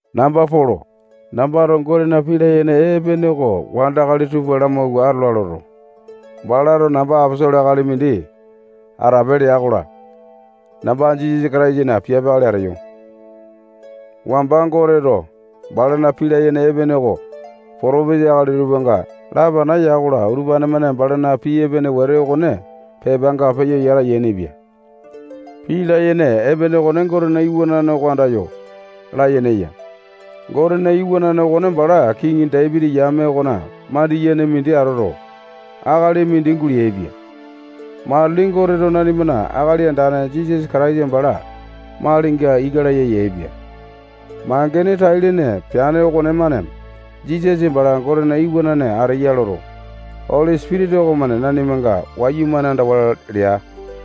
Namba Polo. Nambato Gotena pii layene epene oko wandakali tupa lamauwa atola loto, balato namba aposolo akali mindi atape lea-kola, namba Jisasa Kataisana piape akali ateyo. Wamba Goteto balana pii layene epene oko potopisa akali tupanga lapana ya-kola, utupane-mane balana pii epene wete okone pepanga peyo yata yainipia. Pii layene epene okone Gotena iwanane oko andayo layene eya. Gotena iwanane okone bala kiŋi Dapiti yame okona mandiyene mindi atoto, akali mindi guleaipia. Matili Goteto nanimana Akali Andane Jisasa Kataisa bala malinga ika laya yaepia. Mangene tai-lene peane okonemane Jisasa bala Gotena iwanane ateya loto, Oli Sipitisa okomane nanimanga wayumane andawa lea.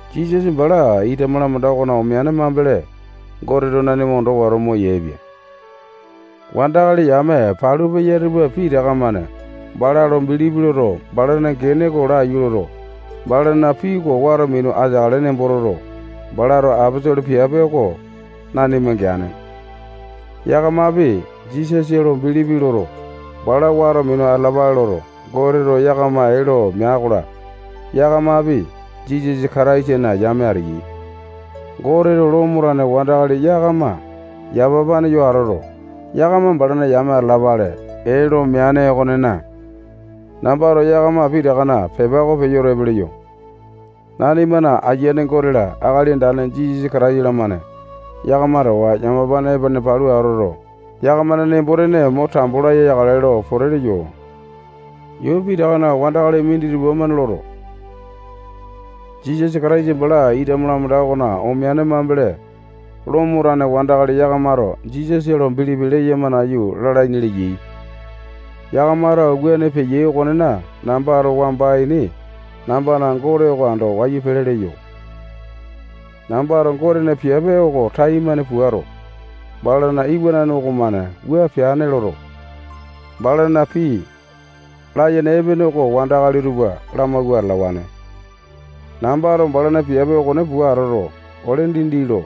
Jisasa bala ita malamanda okona omeane mambele, Goteto nanima ondo wato moyaepia. Wandakali yame palu peya tupa pitaka-mane bala lo bilipi loto, balana gene oko laiyu loto, balana pii oko wato minu ateakale nembo toto, balato aposolo piape oko nanima geane. Yakamapi Jisasa lo bilipi loto, bala wato minu atalapale loto, Goteto yakama ee lo mea-kola, yakamapi Jisasa Kataisana yame ateyai. Goteto Lomo tane wandakali yakama yamapane yo atoto, yakama balana yame atalapale ee lo meane okonena, nambato yakama pitakana pepa oko peyo epe leyo. Nanimana Ayiane Gote-la, Akali Andane Jisasa Kataisa-lamane yakama towa yamapane epene palu atoto, yakamana nembo-tene mo tambo laya yakale lo pote leyo. Yuu pitakana wandakali minditupa-mane loto, Jisasa Kataisa bala ita malamanda okona omeane mambele, Lomo tane wandakali yakamato Jisasa lo bilipi leyama nayu lalaini leyai. Yakamato wuane peyai okonena, nambato wamba ini nambana Gote oko ando wayu pele leyo. Nambato Gotena piape oko taimane puato, balana iwanane okomane wua peane loto, balana pii layene epene oko wandakali tupa lamauwa atalawane. Nambato balana piape okone pua atoto, ole dindi lo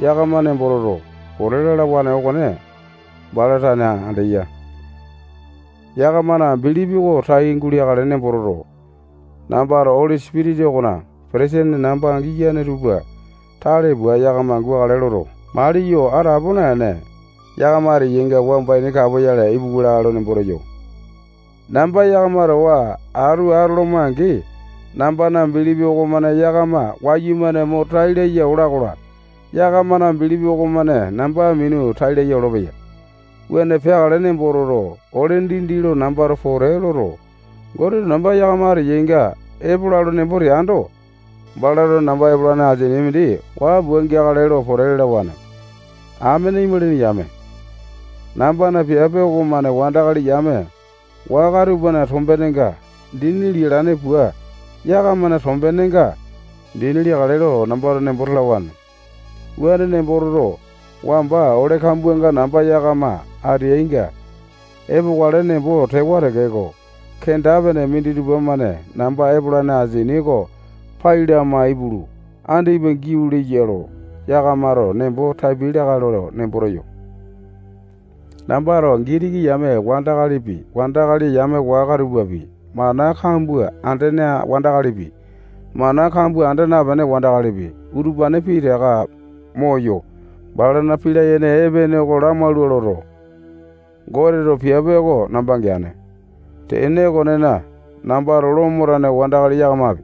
yakama nembo toto, pote lalawane okone bala tane andeya. Yakamana bilipi oko tai guleakale nembo toto, nambato Oli Sipitisa okona petesene namba giyane tupa tale pua yakama gukale loto, maliyo atapo naene, yakama ateyainga wamba ini kapoyale ipuwa lakae lo nembo teyo. Namba yakama towa atu atoloma-angi, nambana bilipi okomane yakama wayumane mo tai laya ola-kola, yakamana bilipi okomane namba minu tai laya olopeya. Wuane peakale nembo toto, ole dindi lo nambato pote loto, Goteto namba yakama ateyainga epola nembo teando, balato namba epolane asini mindi waa pua geakale lo pote lalawane. Amene imalini yame, nambana piape okomane wandakali yame waka tupana tombenga dini lialane pua yakamana tombenenga dini liakale lo nambato nembo talawane. Wuane nembo toto, wamba ole kambuanga namba yakama ateyainga epokale nembo tewa tekeko, kenda-pene minditupa-mane namba epolane asini oko pai lama ipulu, andipa giau leya lo yakamato nembo tapiai lakae lo nembo teyo. Nambato Gitiki yame wandakalipi, wandakali yame waka tupapi, mana kambua andene wandakalipi, mana kambua anda napene wandakalipi, utupane pitaka moyo, balana pii layene epene oko lamaula loto, Goteto piape oko namba geane. Tene okonena, nambato Lomo tane wandakali yakamapi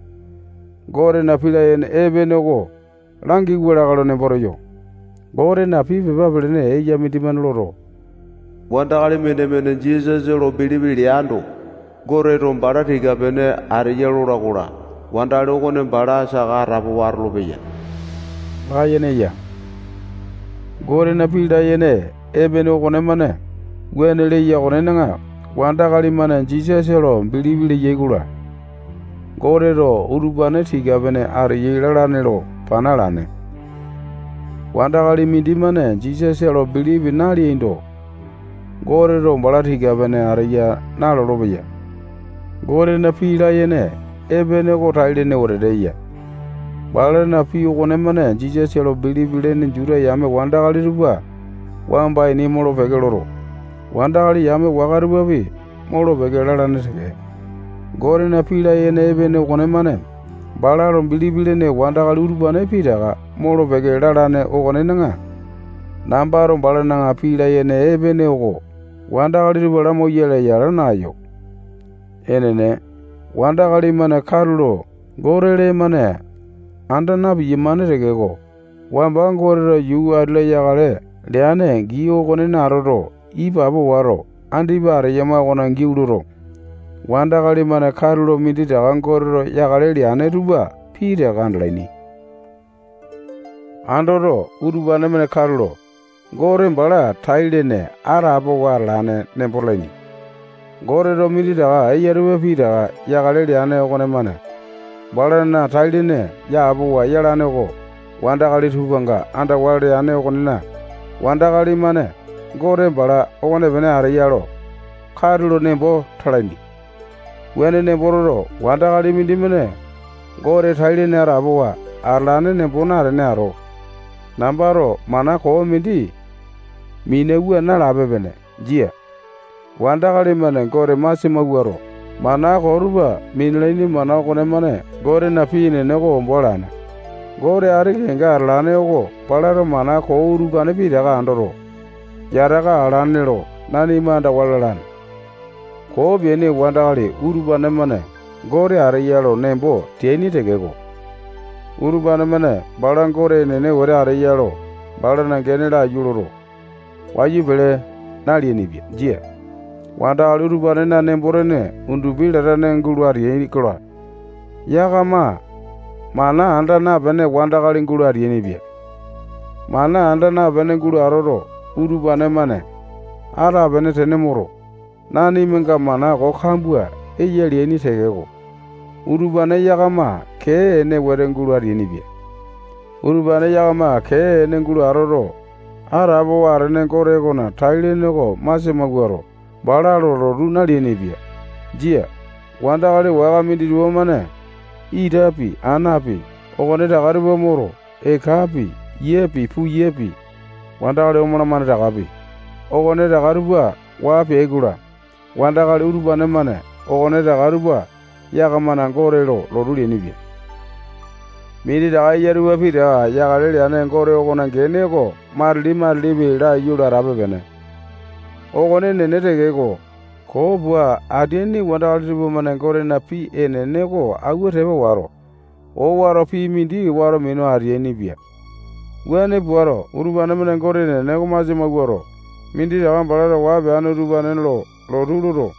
Gotena pii layene epene oko langiwa lakae lo nembo teyo. Gotena pii pepa pelene eya mindimane loto, wandakali mindimane Jisasa lo bilipi leando, Goteto bala tika-pene ateya lola-kola, wandakali okone bala saka atapowa atolopeya layene eya. Gotena pii layene epene okonemane wuane leya okonena, wandakali-mane Jisasa lo bilipi leyai-kola, Goteto utupane tika-pene ateyai lalane lo pana alane. Wandakali mindimane Jisasa lo bilipi naleando, Goteto bala tika-pene ateya nalolo-peya. Gotena pii layene epene oko tai-lene wetete eya. Balana pii okonemane Jisasa lo bilipi lene Juta yame wandakali tupa wamba ini molo-peke loto, wandakali yame waka tupapi molo-peke lalane teke. Gotena pii layene epene okonemane bala lo bilipi lene wandakali utupane pitaka molo-peke lalane okonena, nambato balana pii layene epene oko wandakali tupa lamauyale yala naeyo. Enene, wandakali-mane katulo Gote lee-mane anda na-piyamane tekeko, wamba Goteto yuu ati-la yakale leane gii okonena atoto, ipapo wato, andipa ateyama okona giau loto, wandakali-mane katulo minditaka Goteto yakale leane tupa pitaka andalaini. Andoto, utupane-mane katulo Gote bala tai-lene atapowa atalane nembo talaini. Goteto minditaka eya tupa pitaka yakale leane okonemane balana tai-lene yapowa yalane oko wandakali tupanga andawa leane okonena, wandakali-mane Gote bala okonepene ateya lo katulo nembo talaini. Wuane nembo toto, wandakali mindimane Gote tai-lene atapowa atalane nembo natene ato, nambato mana koo mindi minewa nalape-pene. Jia. Wandakali-mane Gote masia mawuato, mana koo tupa minalaini mana okonemane Gotena pii enene oko ombo alane. Gote ati kenga atalane oko balato mana koo utupane pitaka andoto, yataka alane lo nanima andawa lalane. Koo peaini wandakali utupane-mane Gote ateya lo nembo teaini tekeko, utupane-mane bala Gote enene wete ateya lo balana gene oko laiyu loto, wayu pele naleainipia. Jia. Wandakali utupanena nembo-tene undupi latane gulo atea-kola, yakama mana anda napene wandakali gulo ateainipia. Mana anda napene gulo atoto, utupane-mane atapene tene moto, nanimanga mana kambua eya leaini tekeko, utupane yakama kee ene wete gulo ateainipia. Utupane yakama kee ene gulo atoto, atapowa atene Gote okona tai-lene oko masia mawuato, bala lo lotu naleainipia. Jia. Wandakali waka minditupa-mane itapi, anapi, okonetaka tupa moto, ekapi, yiapi, puyapi, wandakali omalamane takapi, okonetaka tupa waa pea-kola, wandakali utupane-mane okonetaka tupa yakamana gote lo lotu leainipia. Minditaka eya tupa pitaka yakale leane Gote okona gene oko matili-matilipi laiyu lo atape-pene. Okone enene tekeko, koo pua ateaini wandakali tupamane Gotena pii enene oko auwa tepa wato, owato pii mindi wato minu ateainipia. Wuane puato, utupane-mane Gote enene okone masia mawuato, minditaka balato waa peane utupane lo lotu loto,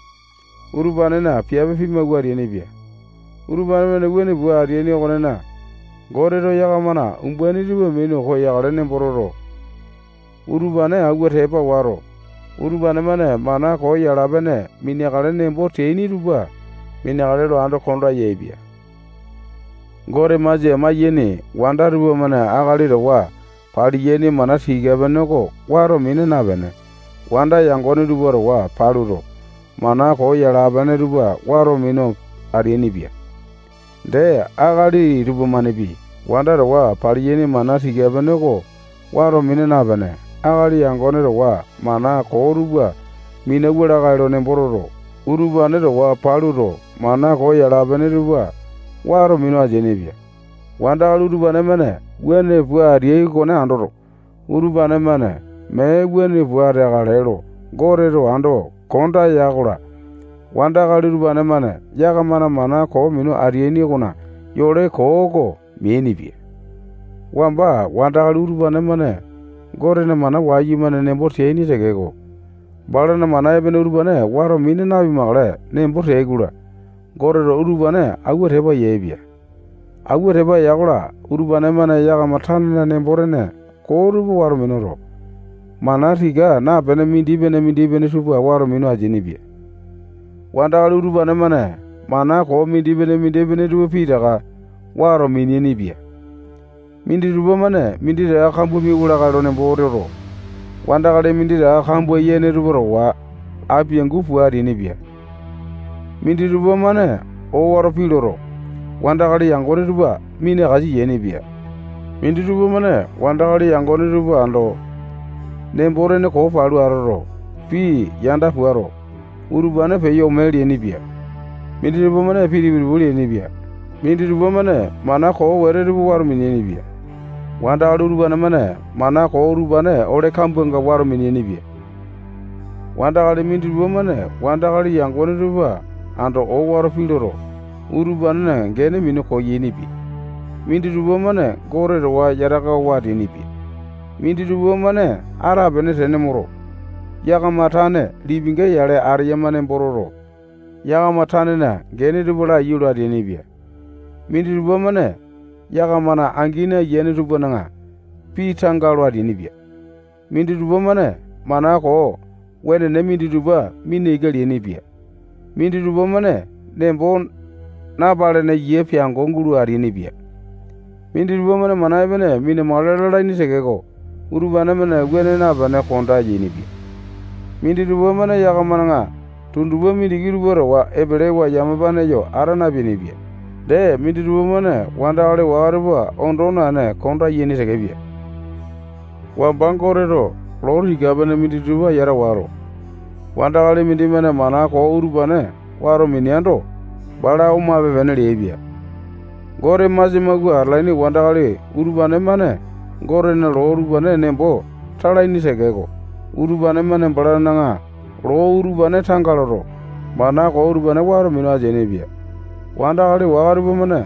utupanena piape pimawua ateainipia. Utupane-mane wuane pua ateaini okonena, Goteto yakamana umbaini tupa minu koyakale nembo toto, utupane auwa tepa wato, utupane-mane mana koo yala-pene mina-makale nembo teaini tupa mineakale lo ando konda yaepia. Gote masia maiyaini wanda tupamane akali towa paliyaini mana tika-pene oko wato mina napene, wanda yangone tupa towa paluto, mana koo yala-pene tupa wato minu ateainipia. Dee, akali tupamanepi wanda towa paliyaini mana tika-pene oko wato mina napene, akali yangone towa mana koo tupa minauwa lakae lo nembo toto, utupane towa paluto, mana koo yala-pene tupa wato minu ateainipia. Wandakali utupane-mane wuane pua ateai okone andoto, utupane-mane mee wuane pua ateakale lo Goteto ando konda ya-kola, wandakali utupane-mane yakamana mana koo minu ateaini okona yole koo oko meainipia. Wamba wandakali utupane-mane Gotena mana wayumane nembo teaini tekeko, balana mana epene utupane wato mina napimakale nembo teai-kola, Goteto utupane auwa tepa yaepia. Auwa tepa ya-kola, utupane-mane yakama tanena nembo-tene koo tupa wato minuto, mana tika napene mindipene-mindipene tupa wato minu ateainipia. Wandakali utupane-mane mana koo mindipene-mindipene tupa pitaka wato miniaini-pia. Minditupa-mane minditaka kambua miauwa lakae lo nembo toto, wandakali minditaka kambua yene tupa towa apiangu pua ateainipia. Minditupa-mane owato pii loto, wandakali yangone tupa minakasa yainipia. Minditupa-mane wandakali yangone tupa ando nembo-tene koo palu atoto, pii yanda puato, utupane peyo ome leainipia. Minditupa-mane pii tipu-tipu leainipia. Minditupa-mane mana koo wete tupa wato miniaini-pia. Wandakali utupane-mane mana koo utupane ole kambuanga wato miniaini-pia. Wandakali minditupa-mane wandakali yangone tupa ando owato pii loto, utupanena gene minu koyainipia. Minditupa-mane Gote towa yatakawa ateainipia. Minditupa-mane atapene tene moto, yakama tane lipinga yale ateyama nembo toto, yakama tanena gene tupa laiyu lo ateainipia. Minditupa-mane yakamana angini ayiane tupana pii tanga lo ateainipia. Minditupa-mane mana koo wenene minditupa mina ika leainipia. Minditupa-mane nembo napalene yia piango gulo ateainipia. Minditupa-mane mana epene mindi mina-makale lalaini tekeko, utupane-mane wuane napene konda yainipia. Minditupa-mane yakamana tundupa mindiki tupa towa epelewa yamapane yo ata napeainipia. Dee, minditupa-mane wandakali waka tupa ondo naene konda yaini tekepia. Wamba Goteto loo tika-pene minditupa yata wato, wandakali mindimane mana koo utupane wato mineando, bala omape-pene leaipia. Gote masia mauwa atalaini wandakali utupane-mane Gotena loo utupane nembo talaini tekeko, utupane-mane balana loo utupane tanga loto, mana koo utupane wato minu ateainipia. Wandakali waka tupamane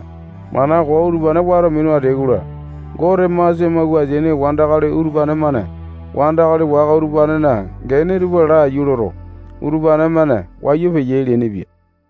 mana koo utupane wato minu ateyai-kola, Gote masia mauwa ateaini wandakali utupane-mane wandakali waka utupanena gene tupa laiyu loto, utupane-mane wayu peyai leainipia.